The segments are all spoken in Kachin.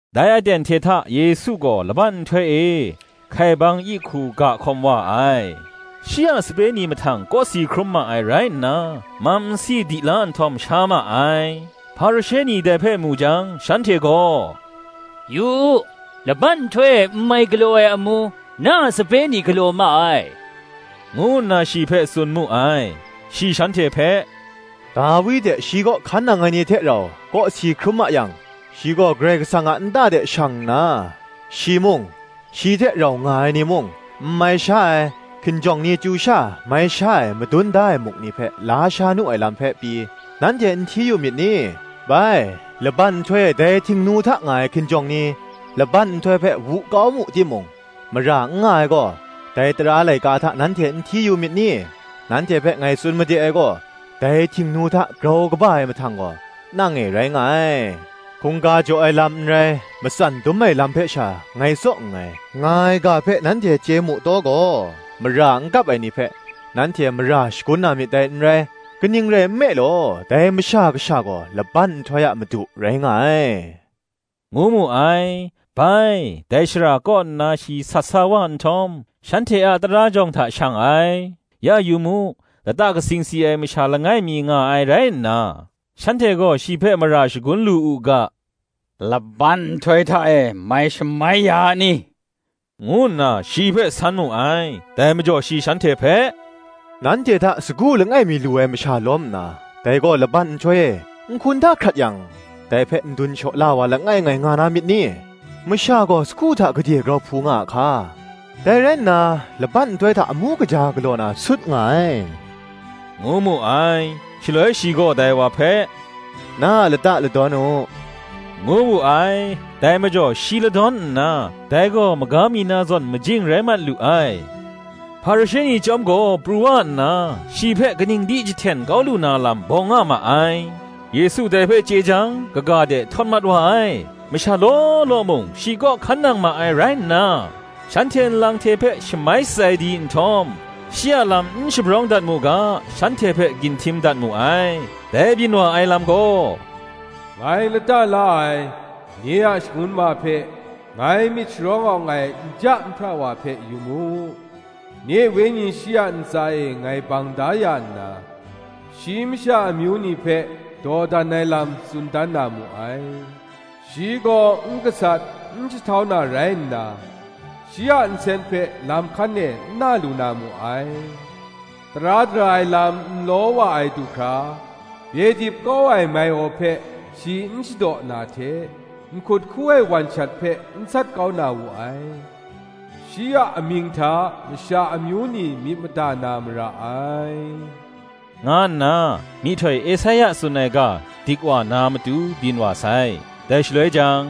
Dai aten hte hta Yesu gaw laban nhtoi e, hkaibang yi hku ga hkawm wa ai, shi a sape ni mahtang kawsi hkrum ma ai rai nna, mam nsi di la nhtawm, sha ma ai. Hparishe ni dai mu jang, shanhte gaw, “Yu u, laban nhtoi e n mai galaw ai amu, na a sape ni galaw ma ai,” ngu nna shi hpe tsun mu ai. Shi shanhte hpe, “Dawi hte shi kaw hkan nang ai ni hte rau kawsi hkrum ma yang, shi gaw Karai Kasang a nta de shang nna, shi mung, shi hte rau nga ai ni mung, n mai sha ai, hkinjawng ni chyu sha mai sha ai madun da ai muk ni hpe la sha nu ai lam hpe pyi, nanhte n hti yu myit ni? Bai, laban nhtoi e dai Htingnu hta nga ai hkinjawng ni, laban nhtoi hpe wu kau mu timung, mara n nga ai gaw, dai tara laika hta nanhte n hti yu myit ni? Nanhte hpe ngai tsun made ai gaw, Dai Htingnu hta grau kaba ai mahtang gaw, nang e rai nga ai. Hkungga jaw ai lam n rai, matsan dum ai lam hpe sha ngai tsaw nngai, nga ai ga hpe nanhte chye mu taw gaw, mara n kap ai ni hpe, nanhte mara shagun na myit dai n rai: kaning rai nme law, dai Masha Kasha gaw, laban nhtoi a Madu rai nga ai,” ngu mu ai. Bai, dai shara kaw nna shi sat sa wa nhtawm, shanhte a tara jawng hta shang ai: ya yu mu, lata katsing si ai masha langai mi nga ai rai nna, shanhte gaw shi hpe, mara shagun lu u ga, “Laban nhtoi hta e mai shamai ya a ni?” ngu nna, shi hpe san mu ai. Dai majaw shi shanhte hpe, “Nanhte hta sagu langai mi lu ai masha lawm nna, dai gaw laban nhtoi e nhkun hta hkrat yang, dai hpe n dun shaw la ai wa langai ngai nga na myit ni? Masha gaw sagu hta gade grau hpu a hka! Dai rai nna, laban nhtoi hta amu kaja galaw na sut nga ai,” ngu mu ai. Shaloi shi gaw dai wa hpe, “Na a lata ladawn u,” ngu wu ai. Dai majaw shi ladawn nna, dai gaw maga mi na zawn majing rai mat lu ai. Hparishe ni chyawm gaw pru wa nna, shi hpe kaning di jahten kau lu na lam bawng nga ma ai. Yesu dai hpe chye jang, kaga de htawt mat wa ai. Masha law law mung, shi kaw hkan nang ma ai rai nna, shanhte nlang hte hpe shamai shatsai di nhtawm, shi a lam n shabrawng dat mu ga, shanhte hpe ginhtim dat mu ai. Dai byin wa ai lam gaw, “Ngai lata la ai, nye a shangun ma hpe, Ngai myit sharawng awng ai nja nhpra wa hpe, yu mu. Nye Wenyi shi a ntsa e ngai bang da ya nna, Shi masha amyu ni hpe dawdan ai lam tsun dan na mu ai. Shi gaw n gasat, n jahtau na rai nna, Shi a nsen hpe lam hkan e n na lu na mu ai. Tara dara ai lam nlaw wa ai du hkra, Bye dip kau ai mai-aw hpe shi n shadaw na hte Nhkut hku ai wan shat hpe, n sat kau na wu ai. Shi a amying hta masha amyu ni myit mada na mara ai,” nga nna, myihtoi Esaia tsun ai ga dik wa na matu byin wa sai. Dai shaloi jang,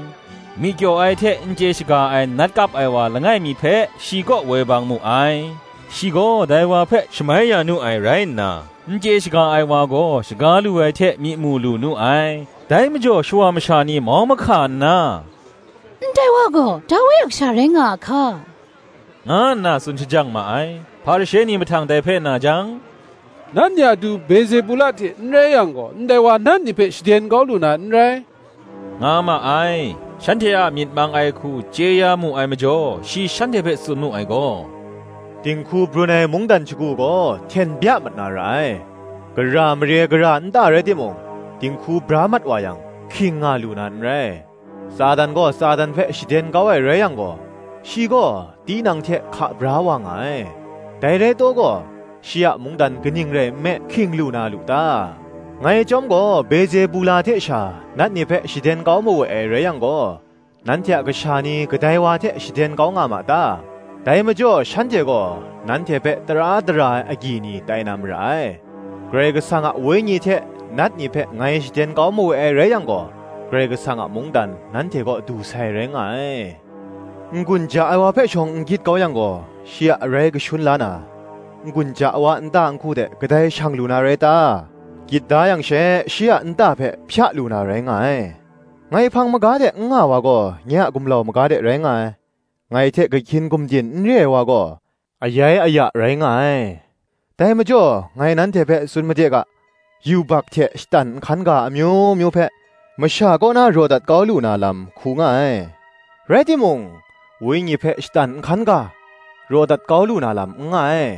myi kyaw ai hte n chye shaga ai nat kap ai wa langai mi hpe, shi kaw woi bang mu ai: shi gaw dai wa hpe shamai ya nu ai rai nna, n chye shaga ai wa gaw shaga lu ai hte myi mu lu nu ai. Dai majaw shawa masha ni mau mahka nna, “Ndai wa gaw Dawi a kasha rai nga a hka?” nga nna tsun shajang ma ai. Hparishe ni mahtang dai hpe na jang, “Nat ni a du Bezebula hte n rai yang gaw, ndai wa nat ni hpe shaden kau lu na n rai,” nga ma ai. Shanhte a myit mang ai hku chye ya mu ai majaw, shi shanhte hpe tsun mu ai gaw, “Dinghku brun ai mungdan shagu gaw hten bya mat na ra ai: gara mare, gara nta rai timung, dinghku bra mat wa yang, hking nga lu na n rai. Satan gaw Satan hpe shaden kau ai rai yang gaw, shi gaw tinang hte hka bra wa nga ai: dai rai taw gaw, shi a mungdan kaning rai nme hking lu na lu ta? Ngai chyawm gaw Bezebula hte sha nat ni hpe shaden kau mawe ai rai yang gaw, nanhte a kasha ni kadai wa hte shaden kau nga ma ta? Dai majaw shanhte gaw nanhte hpe tara dara ai agyi ni tai na mara ai. Karai Kasang a wenyi hte nat ni hpe ngai shaden kau mawe ai rai yang gaw, Karai Kasang a mungdan nanhte kaw du sai rai nga ai. N-gun ja ai wa hpe shawng n gyit kau yang gaw, shi a arai kashun la na, n-gun ja ai wa a nta nhku de kadai shang lu na rai ta? gyit da yang she shi a nta hpe hpya lu na rai nga ai. Ngai hpang maga de n nga ai wa gaw, nye a gumlau maga de rai nga ai: ngai hte kahkyin gumdin n re ai wa gaw, ayai aya rai nga ai. Dai majaw ngai nanhte hpe tsun made ga, yubak hte shatan nhkan ga amyu myu hpe, masha kaw na raw dat kau lu na lam hku nga ai; rai timung, Wenyi hpe shatan nhkan ga, raw dat kau lu na lam n nga ai.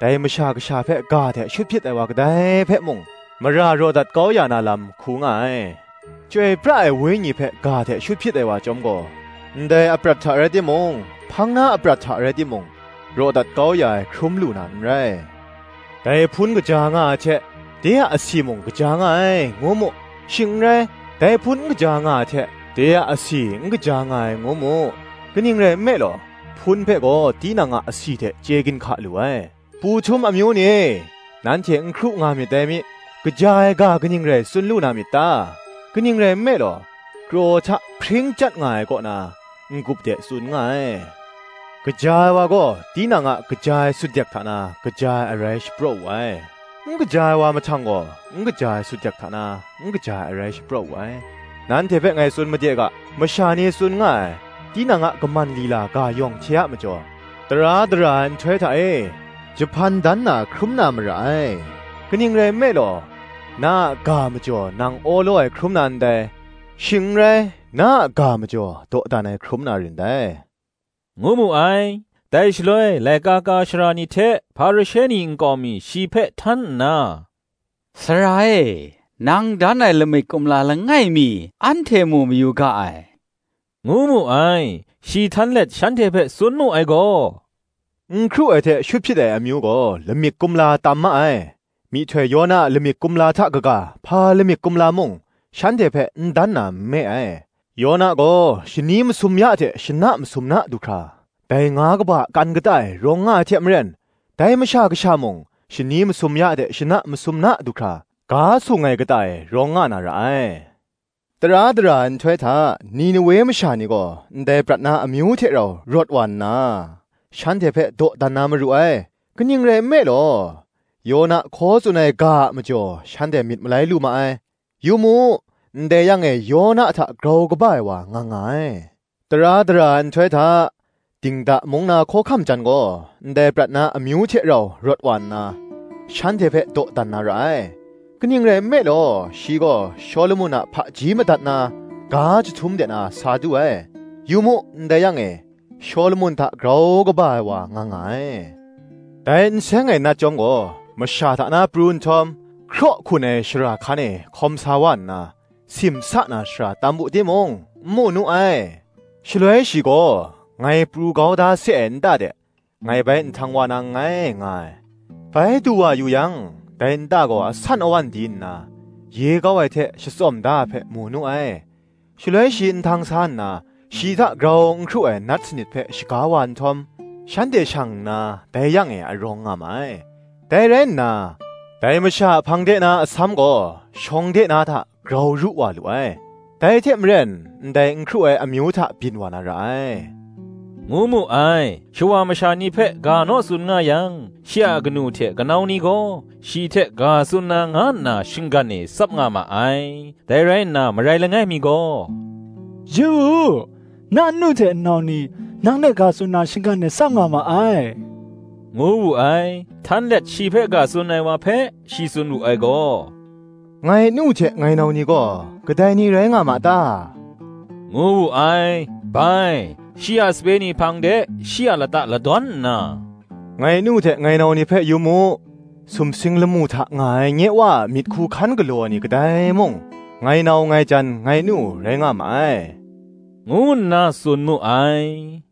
Dai Masha Kasha hpe ga hte shut hpyit ai wa kadai hpe mung, mara raw dat kau ya na lam hku nga ai; Chyoi pra ai Wenyi hpe ga hte shut hpyit ai wa chyawm gaw, ndai aprat hta rai timung, hpang na aprat hta rai timung, raw dat kau ya ai hkrum lu na n rai. Dai hpun kaja nga ai hte, de a asi mung kaja nga ai, ngu mu: shing n rai, dai hpun n kaja nga ai hte, de a asi n kaja nga ai, ngu mu: kaning rai nme law, hpun hpe gaw tinang a asi hte chye ginhka lu ai. Pu htum amyu ni e, nanhte n hkru nga myit dai mi, kaja ai ga kaning rai tsun lu na myit ta? kaning rai nme law, kraw hta hpring chyat nga ai kaw na, n-gup de tsun nga ai. Kaja ai wa gaw tinang a kaja ai sutdek hta na kaja ai arai shapraw wu ai; n kaja ai wa mahtang gaw, n kaja ai sutdek hta na n kaja ai arai shapraw wu ai. Nanhte hpe ngai tsun made ga, masha ni tsun nga ai, tinang a kaman lila ga yawng hte a majaw, tara dara ai nhtoi hta e, jahpan dan na hkrum na mara ai. Kaning rai nme law, na a ga majaw nang awlaw ai hkrum na ndai: shing n rai, na a ga majaw, dawdan ai hkrum na rin dai,” ngu mu ai. Dai shaloi laika ka ai sara ni hte Hparishe ni nkau mi shi hpe htan nna, “Sara e, nang dan ai lamik kumla langai mi, anhte mu mayu ga ai,” ngu mu ai. Shi htan let shanhte hpe tsun mu ai gaw, “N hkru ai hte shut hpyit ai amyu gaw, lamik kumla tam ma ai; myihtoi Yona a lamik kumla hta kaga, hpa lamik kumla mung, shanhte hpe n dan na nme ai. Yona gaw shani masum ya hte shana masum na du hkra, dai nga kaba a kan kata e rawng nga ai hte maren, dai Masha Kasha mung, shani masum ya hte shana masum na du hkra, ga sung ai kata e rawng nga na ra ai. Tara dara ai nhtoi hta, Ninewe masha ni gaw, ndai prat na amyu hte rau rawt wa nna, shanhte hpe dawdan na maru ai: kaning rai nme law, Yona hkaw tsun ai ga a majaw shanhte myit malai lu ma ai: yu mu, ndai yang e, Yona hta grau kaba ai wa nga nga ai. Tara dara ai nhtoi hta, dingda mung na hkawhkam jan gaw, ndai prat na amyu hte rau rawt wa nna, shanhte hpe dawdan na ra ai: kaning rai nme law, shi gaw Shawlumon a hpaji madat na, ga jahtum de na sa du ai: yu mu ndai yang e, Shawlumon hta grau kaba ai wa nga nga ai. Dai n seng ai nat chyawm gaw, masha hta na pru nhtawm, hkraw hkun ai shara hkan e hkawm sa wa nna, simsa na shara tam wu timung, n mu nu ai. Shaloi shi gaw, Ngai pru kau da se ai nta de, ngai bai nhtang wa na nngai, nga ai: bai du wa yu yang, dai nta gaw asan awan di nna, ye kau ai hte shatsawm da ai hpe, mu nu ai. Shaloi shi nhtang sa nna, shi hta grau n hkru ai nat sanit hpe shaga wa nhtawm, shanhte shang nna dai yang e a rawng nga ma ai; dai rai nna, dai masha a hpang de na asam gaw, shawng de na hta, grau ru wa lu ai: dai hte maren ndai n hkru ai amyu hta byin wa na ra ai,” ngu mu ai. Shawa masha ni hpe ga naw tsun nga yang, shi a kanu hte kanau ni gaw, shi hte ga tsun na nga nna shinggan e tsap nga ma ai. Dai rai nna marai langai mi gaw, “Yu u, na nnu hte nnau ni, nang hte ga tsun na, shinggan e tsap nga ma ai,” ngu wu ai. Htan let shi hte ga tsun ai wa hpe shi tsun wu ai gaw, “Ngai nu hte ngai nau ni gaw, kadai ni rai nga ma ta?” ngu wu ai. Bai, shi a sape ni hpang de shi a lata ladawn nna, “Ngai nu hte ngai nau ni hpe yu mu: sumsing lamu hta nga ai nye Wa a myit hku hkan galaw ai ni kadai mung, ngai nau, ngai jan, ngai nu, rai nga ma ai,” ngu nna tsun mu ai.